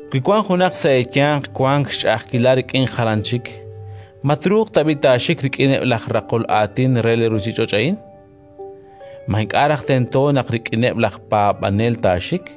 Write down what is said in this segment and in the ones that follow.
Wi wank junaq sa' eeyanq wank xch'a'ajkilal rik'in jalan chik, ma truuq tab'i' taaxik rik'ineb' laj raqol aatin re li ruuchich'och' a'in? Ma ink'a' raj tento naq rik'ineb' laj paab'anel taaxik?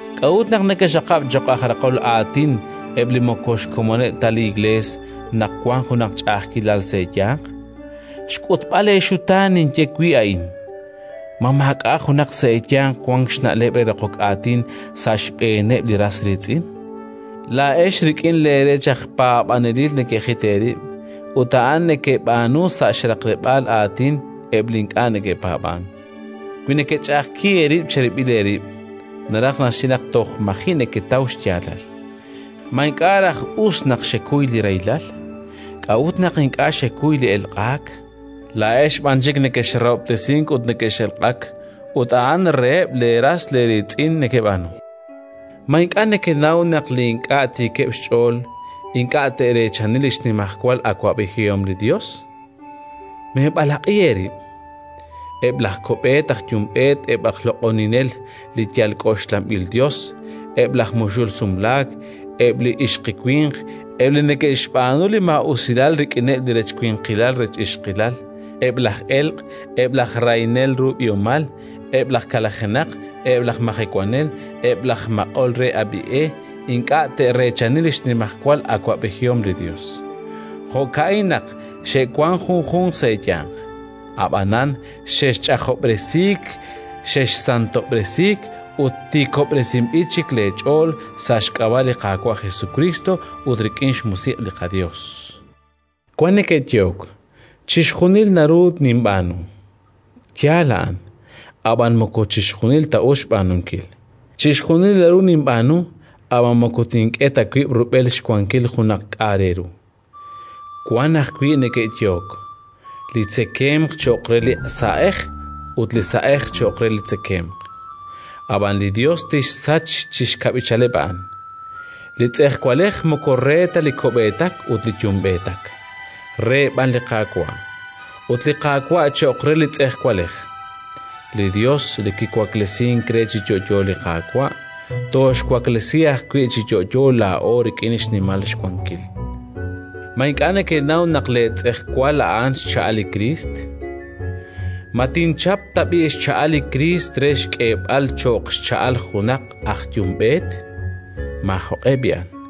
K'a'ut naq nekexaqab' cho'q aj raqol aatin eb' li moko xkomoneb' ta li Iklees, naq wank junaq ch'a'ajkilal sa' eeyanq? Xk'utb'al eexutaan ninye wi' a'in. Ma maak'a' junaq sa' eeyanq wank xna'leb' re raqok aatin sa' xb'eeneb' li ras riitz'in? Laa'ex rik'in leerech aj paab'anelil nekejit eerib', ut a'an nekeb'aanu sa' xraqleb'aal aatin eb' li ink'a' neke'paab'ank. Wi nekech'a'ajki eerib' cherib'il eerib', naraj naxye naq toj maji' neketaw xyaalal. Ma ink'a' raj us naq xekuy li rahilal? K'a'ut naq ink'a' xekuy li elq'aak? Laa'ex b'an chik nekexrahob'tesink ut nekex'elq'ak, ut a'an reheb' leeras eeriitz'in nekeb'aanu. Ma ink'a' nekenaw naq li ink'a' tiikeb' xch'ool ink'a' te'reechani li xnimajwal awab'ejihom li Yos? Meeb'alaq'i eerib'! Eb' laj ko'b'eet aj yumb'eet, eb' laj loq'oninel li yal k'oxlanb'il yos, eb' laj muxul sumlaak, eb' li ixqiwinq, eb' li neke'xb'aanu li maa'usilal rik'ineb' li rech winqilal rech ixqilal, eb' laj elq', eb' laj rahinel ru b'ihomal, eb' laj kalajenaq, eb' laj majewanel, eb' laj maq'ol re ab'i e ink'a' te'reechani li xnimajwal awab'ejihom li Yos. Jo'ka'in naq xe'wank junjunq sa' eeyanq. Ab'anan xexch'ajob'resiik, xexsantob'resiik ut tiikob'resinb'il chik leech'ool sa' xk'ab'a' li Qaawa' Jesukriist ut rik'in xMusiq' li qaYos. Wank neke'yehok: “Chixjunil naru ninb'aanu!”. Yaal a'an, ab'an moko chixjunil ta us xb'aanunkil. Chixjunil naru ninb'aanu, ab'an moko tink'e ta wib' rub'el xwankil junaq k'a' re ru. Wank ajwi' neke'yehok: “Li tzekemq cho'q re li sa'ej ut li sa'ej cho'q re li tzekemq!”, ab'an li Yos tixsach chi xkab'ichaleb' a'an. Li tz'ejwalej moko re ta li ko'b'eetak ut li yumb'eetak, re b'an li Qaawa', ut li Qaawa' cho'q re li tz'ejwalej. Li Yos li kiwaklesink re chi yo'yo li Qaawa', tooxwaklesi ajwi' chi yo'yo laa'o rik'in xnimal xwankil. Ma ink'a' nekenaw naq leetz'ejwal a'an xcha'al li Kriist? Ma tinchap tab'i' xcha'al li Kriist re xk'eeb'al cho'q xcha'al junaq aj yumb'eet? Maajoq'e b'i'an!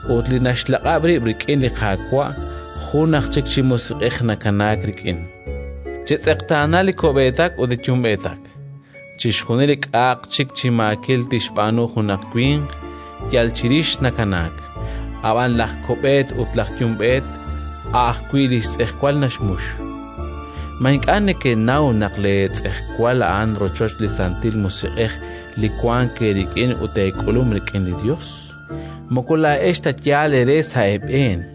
Ut li naxlaq'ab' rib' rik'in li Qaawa', jun aj chik chi musiq'ej nakanaak rik'in. Chetz'eqtaana li ko'b'eetak ut li yumb'eetak! Chixjunil li k'a'aq chik chi maakil tixb'aanu junaq winq, yal chirix nakanaak, ab'an laj ko'b'eet ut laj yumb'eet a' ajwi' li xtz'ejwal naxmux. Ma ink'a' nekenaw naq leetz'ejwal a'an rochoch li Santil Musiq'ej li wank eerik'in ut eek'ulum rik'in li Yos? Moko laa'ex ta yaal eere sa' eeb'een.